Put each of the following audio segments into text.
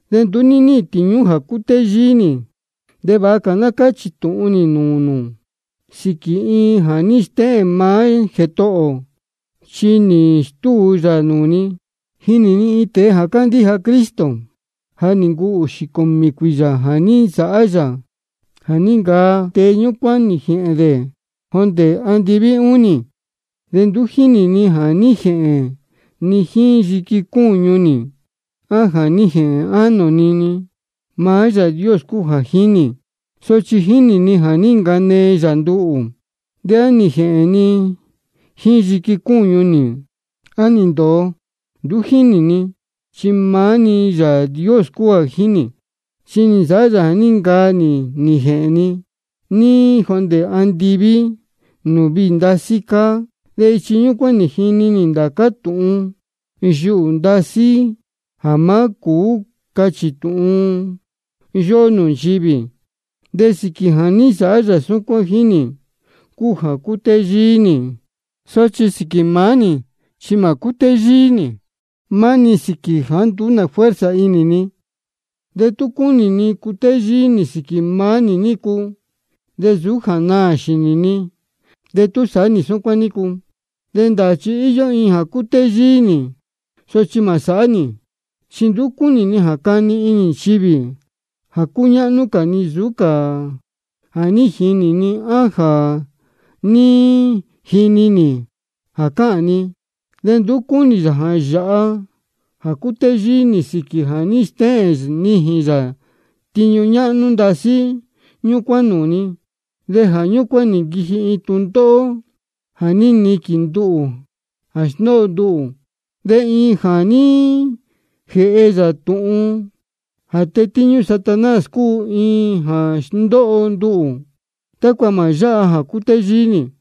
De nduú níhīn tīñú jā cútéyíí nī. De vāha cā ná cáchī tūhun nī nūū nū sīquī iin jā ní stéhēn maá Jētohō ō chi nī stúu yā nūū ni. Jínī ni iin tēe jā cándíja Cristo, de ja nī ncuu ūxī cūmī cuīyā jā ní nsāhá yā jā ní ncaa tēe ñúcuán nī jēhēn dē jondē andiví ūnī. De nduú jínī ni á nī jēhēn ni jíín yiqui cúñu nī, á nī jēhēn ánō ni-ni. Maá Yāā Dios cúu jā jínī. Sochi jínī ni jā ní ncanee yā nduhū. De á nī jēhēn ni jíín yiqui cúñu nī, á nī ndōo, nduú jínī ni, chi maá-ni Yāā Dios cúu jā jínī. Chi nī nsāhá yā jā ní ncaa nī nī jēhēn ni jondē andiví nūū viī ndasí cáá. De ichi ñúcuán nī jini nī ndācá tūhun yuhū ndasí jā má cūú cachī tūhun yóhó nchivī. De sīquī jā ní nsāhá yā súcuán jíín nī cúu jā cutéyíí nī, sochi sīquī maá nī chi mā cútéyíí nī. Chi cutéyíí nī maá-ni sīquī jāá nduú nā fuerza inī ni. De tú cúnī ni cutéyíí nī sīquī maá nī nícu, de nsūú jā naā xīnī ni de tú sāhá nī súcuán nícu, chi ndāā jā íyó iin jā cuu cutéyíí nī. Sochi mā sāhá nī, chi nduú cúnī ni jā cani inī nchivī jā cúñáhnú cā ni nsūú cā jā ní jinī ji á jā ní jini ji jā cáhān ni. De nduú cúnī yā jā yāha jā cutéyíí nī sīquī jā ní stéhēn nijīn yā tiñu ñáhnú ndasí ñúcuán nūū ni, de jā ñúcuán nī nquiji iin tūndóhó jā níquīn nduhū de sndóho nduhū. De iin jā ní jēhe yā tūhun jā tetíñú Satanás cúu, iin jā sndóho nduhū, tácua mā yáha jā cutéyíí nī.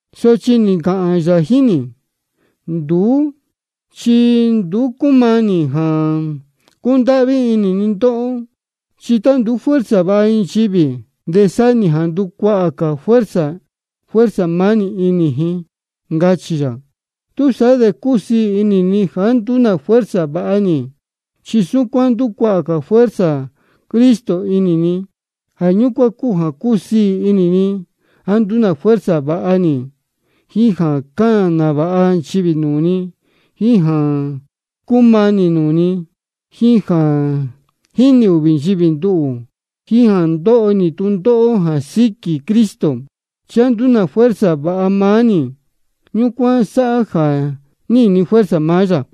Sochi nī ncāhān yā jíín nī: Nduú chi nduú cúmanī jā cúndáhví inī ni ndóhó. Chi tá nduú fuerza vāha iin nchivī, de sáhá nī jā ndúcuahā cā fuerza maá nī inī ji, ncachī yā. Túsaá de cúsiī inī ni jāá nduú fuerza vāha nī, chi súcuán ndúcuahā cā fuerza Cristo inī ni. Jā ñúcuán cúu jā cúsiī inī ni jāá nduú fuerza vāha nī, jíín jā cáhān nāvāha nchivī nūū ni, jíín jā cúmanī nūū ni, jíín jā jínī ūhvī ji nduhū, jíín jā ndóho nī tūndóhó jā síquī Cristo. Chi jāá nduú fuerza vāha maá nī, ñúcuán sáhá jā níhīn ni fuerza maá yā.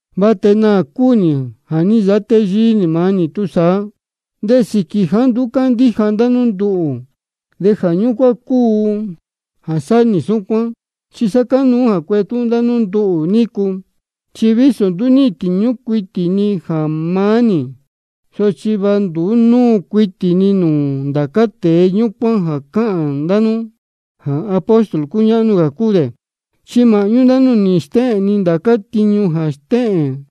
De va tēe naā cúu nī jā ní nsāhá téyíí nī maá nī túsaá. De sīquī jāá nduú cándíja ndá nú nduhū, jā ñúcuán cúu jā sáhá nī súcuán. Chi sa cánuú jā cuetúhún ndá nú nduhū nícu. Chi vísō nduú tiñu cuitī ni jā maá nī, sochi va nduú núu cuitī ni nūū ndācá tēe ñúcuán jā cáhān ndá nú jā apóstol cúñáhnú cúu dē. Chi māhñú ndá nú nī nsāhá nī ndācá tiñu jā stéhēn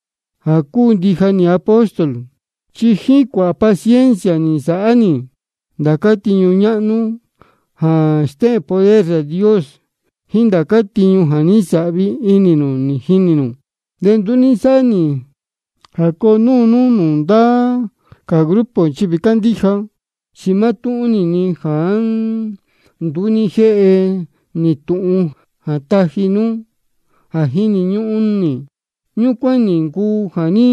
jā cúu ndija nī apóstol. Chi jíín cuāhā paciencia nī nsāhá nī ndācá tiñu ñáhnú jā stéhēn poder Yāā Dios, jíín ndācá tiñu jā ní nsāhvi inī nū nī jinī nū. De nduú ní nsáhá nī ndá ndóhó jā coo núu nú nūū ndá cā grupo nchivī cándíja, chi mátúhún-ni jāá nduú ní jéhe nī tūhun jā taji nú jā jíni ñúhún nī, ñúcuán-ni cúu jā ní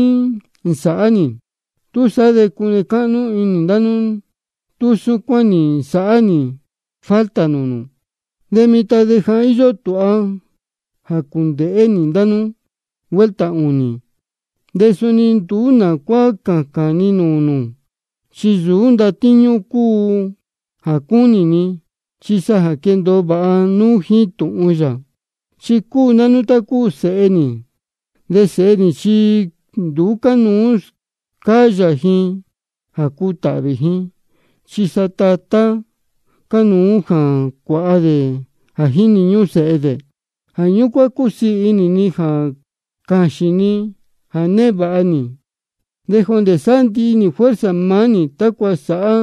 nsāhá nī. Túsaá de cune cáhnú inī ndá nú tú súcuán nī nsāhá nī falta nūū nū. De mitan de ja íyó tūha nī jā cuéndēhé nī ndá nú vuelta ūnī. De suni nduú nā cuá cācān ni nūū nū, chi nsūú ndatíñú nú cúu jā cúnī ni, chi sa jā ná quéndōo vāha nú jíín tūhun yā. Chi cúu ndá nú tá cúu sēhe nī, de sēhe chi nduú cánuú scáyā ji jā cuu tatá ji, chi sa tatá cánuú jā cuāha dē jā jíni ñúhún sēhe dē. Jā ñúcuán cúsiī inī ni jā cāxīn ni jā névāha nī, de jondē sndíhi nī fuerza maá nī, tácua sāhá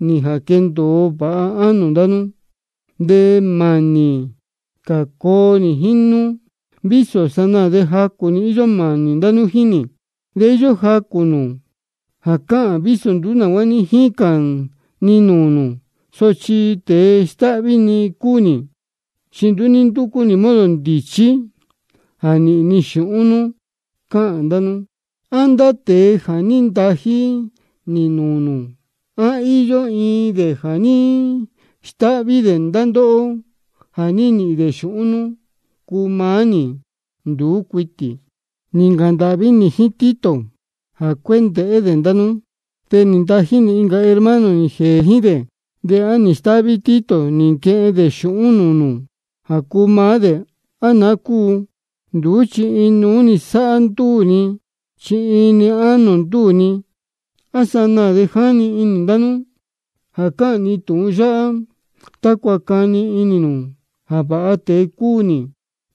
nī jā quendōo vāha ánō ndá nú. De mānī cā coo nī jíín nú, vísō sanaā de jacū-ni íyó mānī ndá nú jíín nī. De íyó jacū nū jā cáhān jā vísō nduú nā cuá ní jícān ni nūū nū, sochi tēe stáhví cúu nī, chi nī nducú nī modo ndīchí jā nīhīn ni xūhún nú, cáhān ndá nú. De nduú. ¿A ndá tēe jā ní ntají nī nūū nū, á íyó iin dē jā ní stáhví dē ndá ndóhó jā nīhīn dē xūhún nú cuu maá nī? Nduú cuitī. Nī ncāhān ndāhví nī jíín Tito jā cuéndēhé dē ndá nú, de nī ntají nī incā hermano nī jēē jíín dē. ¿De á nī stáhví Tito nī nquehen dē xūhún nūū nū jā cuu maá dē, á naá cúu? Nduú, chi inuú-ni sáhá ndúū ni, chi iin-ni ánō ndúū ni. A sanaā de jáni inī ndá nú jā cáhān ni tūhun yáhá tácua cani inī nū jā vāha tēe cúu nī.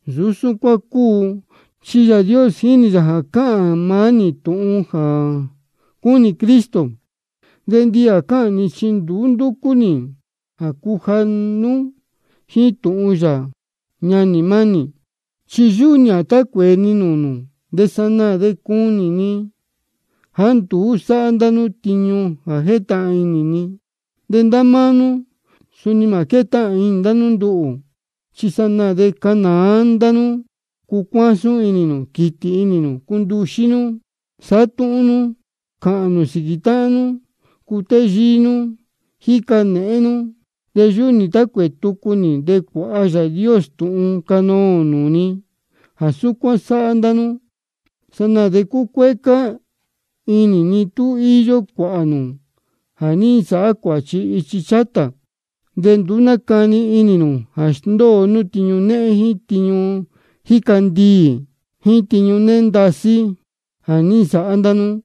Nsūú súcuán cúu, chi Yāā Dios jínī yā jā cáhān ni maá-ni tūhun jā cúnī Cristo. De ndihi jā cáhān ni chi ndúcú nī jā cuja nú jíín tūhun yā, ñanī mánī. Chi yúhú nī jā tá cuēē ni nūū nū, de sanaā de cunī ni jāá nduú sáhá ndá nú tiñu jā jétahān inī ni. De ndá máá nú suni mā quétahān inī nū nduhū. Chi sanaā de cánāá ndá nú, cúcuásún inī nū, quítī inī nū, cúnduxí nú, sátúhún nú, cáhān nū sīquī táhán nú, cútéyíí nú, jíca nēhén nú. De yúhú nī jā tá cuēē tucu nī de cuāha Yāā Dios tūhun canoō nūū ni jā súcuán sáhá ndá nú. De sanaā de cucuécá inī ni tú íyó cuāhā nū jā ní nsāhá cuāchi ichi chátā, de nduú nácani inī nū jā sndóo nú tiñu téhén, jíín tiñu jíca ndiī, jíín tiñu néhén ndasí jā ní nsāhá ndá nú.